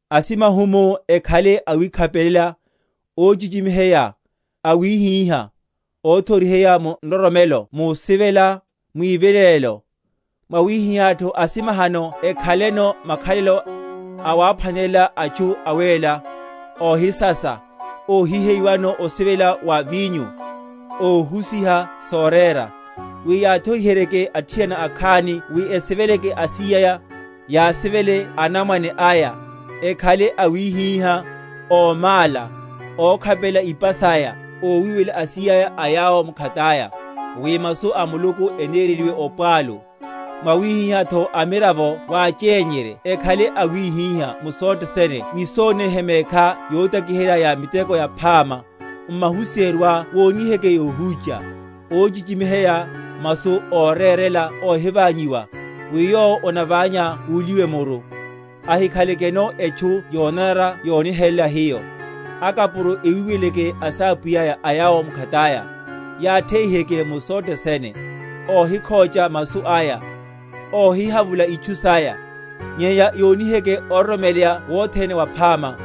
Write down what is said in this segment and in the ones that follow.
Asimahumu ekhale awikhapelela, óchichimiheya, awíhíha, óthoriheya mu nroromelo, musivela, mwivilelelo. Mwawihihátho asimahano ekhaleno makhalelo awaphwanelela atchu awéla, óhisasa, óhiheyiwano osivela wa vinyo, óhusiha sorera; wi yathoriheryeke athiana akhani wi esiveleke asíyaya, yasivele anamwane aya, ekhale awíhíha, ómála, ókhapelela ipa saya, ówiwelela asíyaya a yawo mkhataya, wi masu a Muluku enereliwe opwalu. Mwawihihátho amiravo wachenyerye ekhale awíhíha; mu sothe sene wisoneihe mekhá yotakiherya ya miteko yaphama; m’mahusiheryoá woniheke yohúcha, óchichimiheya, masu órérela óhiványiwa; wi yowo onaványa uliwe muru, ahikhalakano etchu yonanara yonihelela hiyo. Akapuro ewiweleleke asapwiyáya a yawo mkhataya, yatheiheke mu sothe sene; óhikhocha masu aya; óhihavula itchu saya, nyenya yoniheke ororomeleya wothene waphama;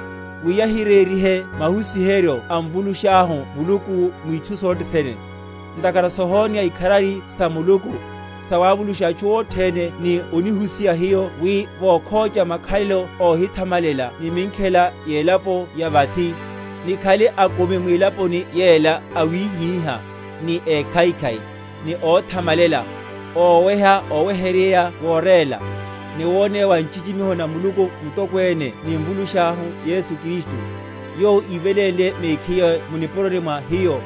wi yahirerihe mahusiheryo a Mvulushahu Muluku mwitchu sothe sene. Ntakhara sohoneya ikharari sa Muluku, sawavulusha atchu othene, ni onihusiha hiyo wi, vokhocha makhalelo óhithamalela ni minkhela yelapo ya vathi, nikhale akumi mwilaponi yela awíhíha, ni ékhaikhai, ni óthamamalela; óweha oweheryerya worela, ni woneya wa nchichimiho na Muluku mutokwene ni Mvulushahu Yesu Kristu; yowo ívelénle mehkiye mu nipuroni mwa hiyo,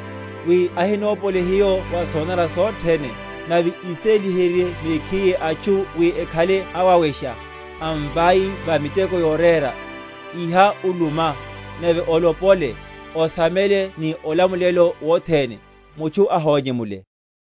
wi ahinopole hiyo wa sonanara sothene, nave íséliherye mekhiye atchu wi ekhale awawesha, amvai va miteko yorera. Iha uluma, nave olopole, osame ni olamulelo wothene. Mutchu ahonyemule.